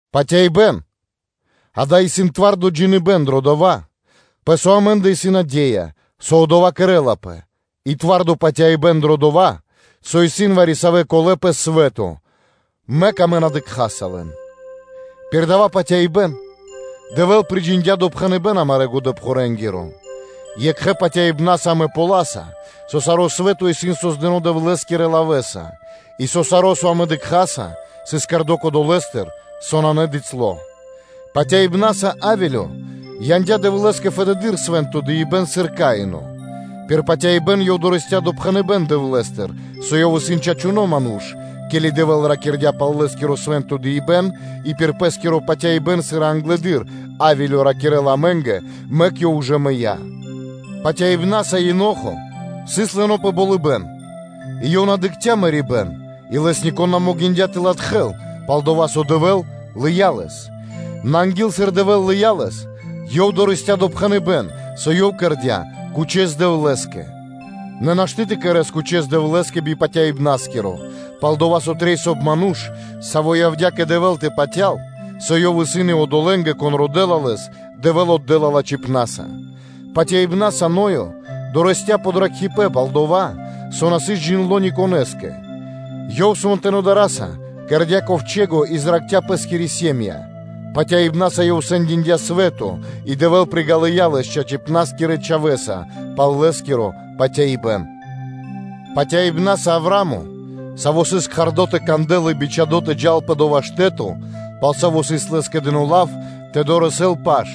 Патяибэ́н – дава́ исын зорало́ (твардо) джиныбэ́н дро дова́, пэ со амэ́ндэ исын наде́я, со одова́ кэрэ́лапэ пхэрдэ́с, и зорало́ патяибэ́н дро дова́, со исын вари-савэ́ чачипэна́ пэ свэ́то, мэк амэ на дыкхаса лэн, пир дава́ патяибэ́н Дэвэ́л приджиндя допхэныбэ́н амарэ́ годэ́-пхурэ́нгиро. Екхэ́ патяибна́са амэ ґалёваса, со саро́ свэ́то исын создыно́ Дэвлэ́скирэ лавэ́са, и со саро́, со амэ дыкхаса, сыс кэрдо́ долэ́стыр, со нанэ бицяло́. Патяибна́са Авелё яндя́ Дэвлэ́скэ фэдэды́р свэ́нто дыибэ́н, сыр Каино; пир патяибэ́н ёв дорэсця́ допхэныбэ́н Дэвлэ́стыр, со ёв исын чачуно́ ману́ш, ке́ли Дэвэ́л ракирдя́ пал лэ́скиро свэ́нто дыибэ́н и пир Пэ́скиро патяибэ́н, сыр и англэды́р, Авелё ракирэ́ла амэ́нгэ, мэк ёв ужэ мыя́. Патяибна́са Енохо сыс лыно́ пэ болыбэ́н, и ёв на дыкхця́ мэрибэ́н, и лэс нико́н на могиндя́ тэ латхэл, пал-дова́ со Дэвэ́л лыя́ лэс. Нэ анги́л, сыр Дэвэ́л лыя́ лэс, ёв дорэсця́ допхэныбэ́н, со ёв кэрдя́ кучэс Дэвлэ́скэ. Нэ нашты́ тэ кэрэ́с кучэс Дэвлэ́скэ би патяибнаскиро, пал-дова́ со трэй, соб (кай) ману́ш, саво́ явдя́ кэ Дэвэ́л тэ патял, со Ёв и ваш одолэ́нгэ, кон родэ́ла Лэс, Дэвэ́л отдэ́ла лачхипна́са. Патяибна́са Ноё дорэсця́ подракхибэн пал дова́, со на сыс джиндло́ ни конэ́скэ; ёв свэнтонэ́ дара́са кэрдя́ ковчэго и зракхця́ пэ́скири сэ́м΄я (ири́). Патяибна́са ёв сэндиндя свэ́то, и Дэвэ́л приґалыя лэс чачипнаскирэ чхавэ́са пал лэ́скиро патяибэ́н. Патяибна́са Авраа́мо, саво́ сыс кхардо тэ кандэл и сыс бичхадо́ тэ джал пэ дова́ штэ́то, пал саво́ сыс лэ́скэ дыно́ лав тэ дорэсэл паш;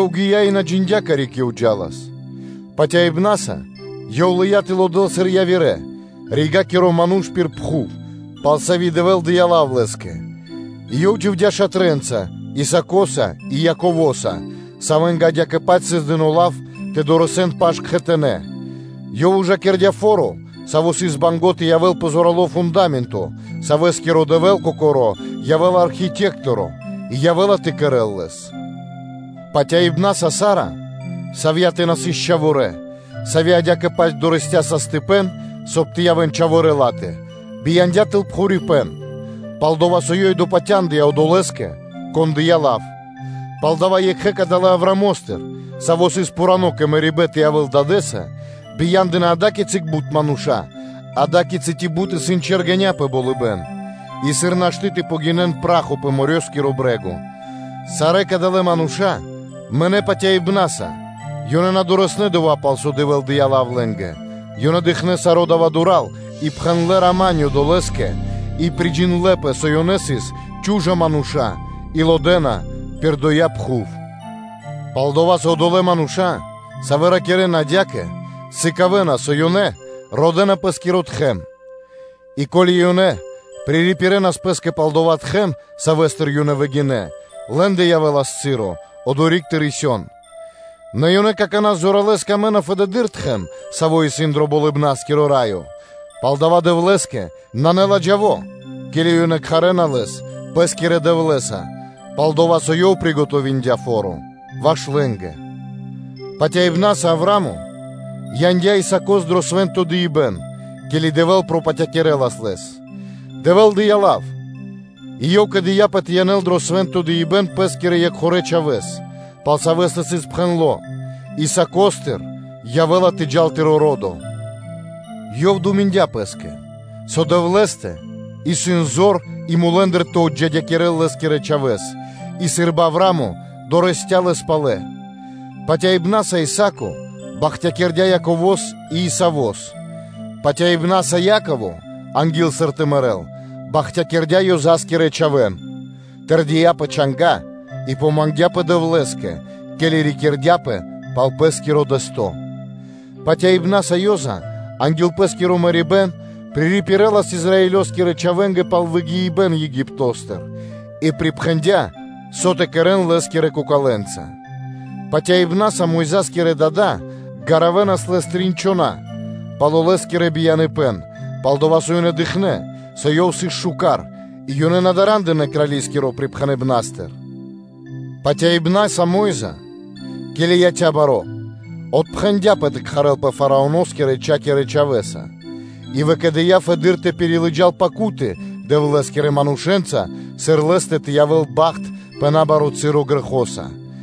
ёв гия́ и на джиндя́, карик ёв джа́лас. Патяибна́са ёв лыя́ тэ лодэл сыр явирэ – ригакиро ману́ш пир пхув, пал сави́ Дэвэ́л дыя́ лав лэ́скэ; и ёв дживдя́ шатрэ́нца Исаакоса и Яковоса, савэ́нгэ адя́кэ-паць сыс дыно́ лав тэ дорэсэн паш кхэтанэ́; ёв ужакирдя фо́ро, саво́ сыс банго́ (мусиндя) тэ явэ́л пэ зорало́ фунда́менто, савэскиро Дэвэ́л Кокоро́ явэ́ла архитекторо и явэ́ла тэ кэрэ́л лэс. Патяибна́са Саара, савьятэ на сыс чхаворэ́, сави́ адя́кэ-паць дорэсця́ састыпэн, соб (кай) тэ явэ́н чхаворэ́ ла́тэ, бияндя́ тэл пхурипэн, пал дова́ со ёй допатяндыя Одолэ́скэ, Кон дыя́ лав. Палдава́ екхэ́ кадалэ́ Авраамостыр, саво́ сыс пхуро́ кэ мэрибэ́н тэ явэ́л дадэ́са, бия́ндынэ ада́кицы бут мануша́, ада́кицы ци бут исын чэргэня́ пэ болыбэ́н и сыр нашты́ тэ гинэс саро пра́хо пэ морёскиро (дэрьявэ́скиро) брэ́го. Сарэ́ кадалэ́ мануша́ мынэ́ патяибна́са, ёнэ на дорэснэ́ дова́, пал со Дэвэ́л дыя́ лав лэ́нгэ, ёнэ дыкхнэ́ саро́ дава́ дура́л и пхэндлэ́ “рама́нё” (миро) долэ́скэ и приджиндлэпэ, со ёнэ сыс чу́жа мануша́ и лодэна пир доя́ пхув. Пал-дова́, со одолэ́ мануша́, савэ́ ракирэ́на адя́кэ, сыкавэ́на, со ёнэ родэ́на пэ́скиро тхэм (отечэство). И ко́ли ёнэ пририпирэнас пэ́скэ пал дова́ тхэм, савэ́стыр ёнэ выгинэ́, лэ́ндэ явэ́лас часо одори́к тэ рисён; нэ ёнэ какана́ зоралэ́с мангэна фэдэды́р тхэм, саво́ исын дро Болыбна́скиро Раё, палдава́ Дэвлэ́скэ нанэ ладжаво, ке́ли ёнэ кхарэ́на Лэс пэ́скирэ Дэвлэ́са; пал-дова́ со Ёв приготовиндя фо́ро ваш лэ́нгэ. Патяибна́са Авраа́мо яндя́ Исаакос дро свэ́нто дыибэ́н, ке́ли Дэвэ́л пропатякирэлас лэс; Дэвэ́л дыя́ лав и ёв скэдыяпэ тэ янэл дро свэ́нто дыибэ́н пэ́скирэ екхорэ чхавэ́с; пал савэ́стэ сыс пхэндло́: “Исаакостыр явэ́ла тэ джал дурэдыр тыро́ ро́до”; ёв думиндя пэ́скэ, со Дэвлэ́стэ исын зор и мулэ́ндыр тэ отджидякирэл лэ́скирэ чхавэ́с, и сы́рбы Авраа́мо дорэсця́ лэс палэ. Патяибна́са Исаа́ко бахтякирдя́ Яково́с и Исавос. Патяибна́са Яково анги́л, сыр тэ мэрэ́л, бахтякирдя́ Ёза́скирэ (Иосифо́скирэ) чхавэ́н, тэрдия́ пэ чанга́ и помангдяпэ Дэвлэ́скэ, ке́ли рикирдяпэ пал пэ́скиро дэсто́. Патяибна́са, со явэ́ла анги́л, Ёза анги́л пэ́скиро мэрибэ́н пририпирэлас Израилёскирэ чхавэ́нгэ пал выгиибэн Египто́стыр и припхэндя́, со тэ кэрэ́н лэ́скирэ кокалэнца. Патяибна́са Мойза́скирэ дада́ гаравэнас лэс трин чхона́ пало́ лэ́скиро бияныпэ́н, пал-дова́ со ёнэ дыкхнэ́, со ёв сыс шука́р, и ёнэ на дара́ндынэ крали́скиро припхэныбнастыр. Патяибна́са Мо́йза, ке́ли яця́ баро́, отпхэндяпэ тэ кхарэлпэ Фараоно́скирэ-чхакирэ чхавэ́са; и выкэдыя́ фэдэды́р тэ пирилыджал мэ́ньки (муки) Дэвлэ́скирэ манушэ́нца, сыр лэ́стэ тэ явэ́л бахт пэ набаро́ часо грэхоса,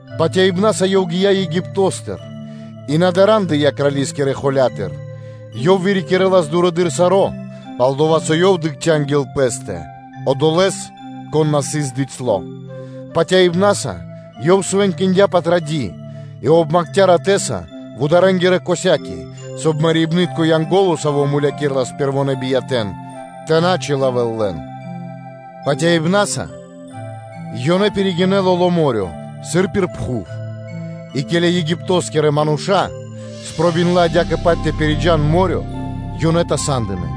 Патяибна́са ёв гия́ Египто́стыр и на дарандыя крали́скирэ холя́тыр; ёв вырикирэлас дурэды́р саро́, пал-дова́ со ёв дыкхця́ анги́л пэ́стэ Одолэ́с, Кон на сыс бицяло́. Патяибна́са ёв свэнкиндя Патради́ и обмакхця ратэ́са вударэнгирэ касяки, соб (кай) Мэрибнытко янго́ло, саво́ мулякирэлас пэрвонэ́ биятэ́н, тэ на чилавэл лэн. Патяибна́са ёнэ пиригинэ́ Лоло́ мо́рё (дэрья́в), сыр пир шуки́ пхув; и ке́ли Египто́скирэ мануша́ спробиндлэ адя́кэ-паць тэ пириджан мо́рё (дэрья́в), ёнэ тасадынэ.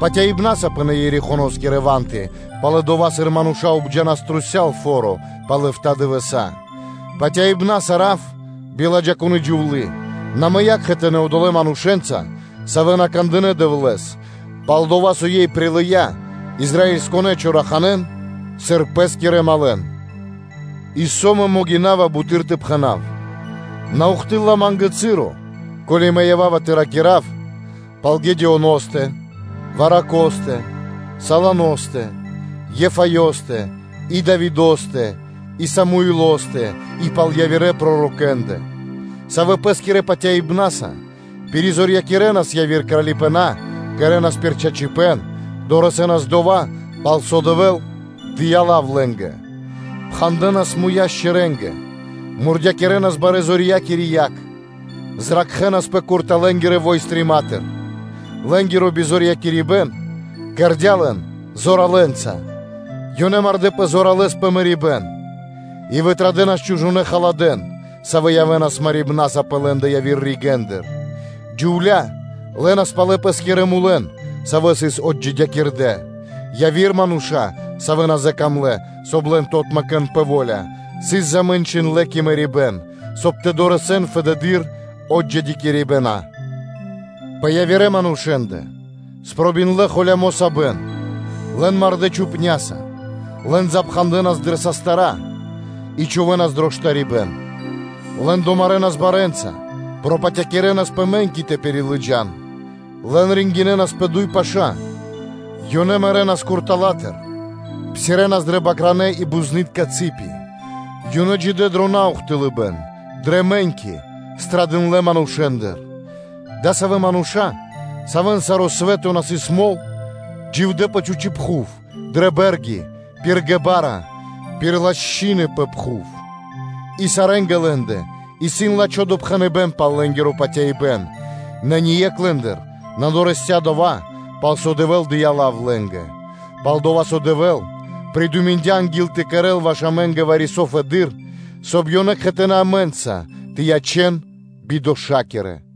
Патяибна́са пынэ́ Ерихоноскирэ ва́нты пало́ (после) дова́, сыр мануша́ обджанас трусця́л фо́ро пал эфта́ дывэса́. Патяибна́са Раав (Рахаб), биладжакуны джувлы́, на мыя́ кхэтанэ́ одолэ́ манушэ́нца, савэ́ на кандынэ́ Дэвлэ́с, пал-дова́ со ёй прилыя́ Израилёскирэ поддыкхибнаскирэн (чораханэн), сыр пэ́скирэ малэн. И со мэ могина́ва буты́р тэ пхэна́в? На ухтылэ́ла (на́доси) ма́нгэ часо, ко́ли мэ ява́ва тэ ракира́в пал Гедеоностэ, Варакостэ, Салосоностэ, Ефаёстэ и Давидо́стэ и Самуилостэ и пал явирэ пророкэ́ндэ: савэ́ пэ́скирэ патяибна́са пиризорьякирэнас яви́р кралипэна́, кэрэ́нас пир чачипэ́н, дорэсэнас дова́, пал со Дэвэ́л дыя́ лав лэ́нгэ, пхандэнас муя́ шчэрэ́нгэ (левэнгэ), мурдякирэнас барэ́-зорьякири яг, зракхэнаспэ курталакирэ войстрима́тыр (чолыпнастыр); лэ́нгиро бизорьякирибэн кэрдя́ лэн зоралэнца, ёнэ мардэ́пэ зоралэ́с пэ мэрибэ́н и вытрадэнас чужонэ́ халадэ́н, савэ́ явэ́нас марибна́са пэ лэ́ндэ явирэ ригэ́ндыр. Джувля́ лэнас палэ пэ́скирэ мулэн, савэ́ сыс отджидякирдэ; яви́р мануша́, савэ́ на закамлэ, соб (кай) лэн тэ отмэкэн кэ во́ля, сыс замэнчиндлэ пэ мэрибэ́н, соб (кай) тэ дорэсэн фэдэды́р отджидякирибэна, пэ явирэ манушэ́ндэ сыс холямо́ сабэн, лэн мардэ́ чхупня́са, лэн пхандэнас дрэ састыра́ и чхувэ́нас дро штарибэ́н. Лэн домарэнас барэ́нца, пропатякирэнас пэ мэ́ньки тэ пирилыджан, лэн пилинэнас (ризилинэ́нас) пэ дуй паша́; ёнэ мэрэнас куртала́тыр, псирэнас дрэ бакранэ́ и бузны́тка (козы́тка) цы́пи, ёнэ дживдэ́ дро наухтылыбэн, дрэ мэ́ньки; страдындлэ манушэ́ндыр, адасавэ́ мануша́, савэ́н саро́ свэ́то на сыс мол, дживдэ́ пэ чхучэ́ прахи, дрэ бэ́рги, пир ґебара́ (пешчэры), пир лошчыны пэ пхув. И сарэ́нгэ лэ́нгэ исын лачхо́ допхэныбэ́н пал лэ́нгиро патяибэ́н, нэ ние́кх лэ́ндыр на дорэсця́ дова́, пал со Дэвэ́л дыя́ лав лэ́нгэ. Пал-дова́ со Дэвэ́л придуминдя анги́л тэ кэрэ́л ваш амэ́нгэ вари-со фэдэды́р, соб (кай) ёнэ кхэтанэ́ амэ́нца тэ ячэн бидошакирэнца.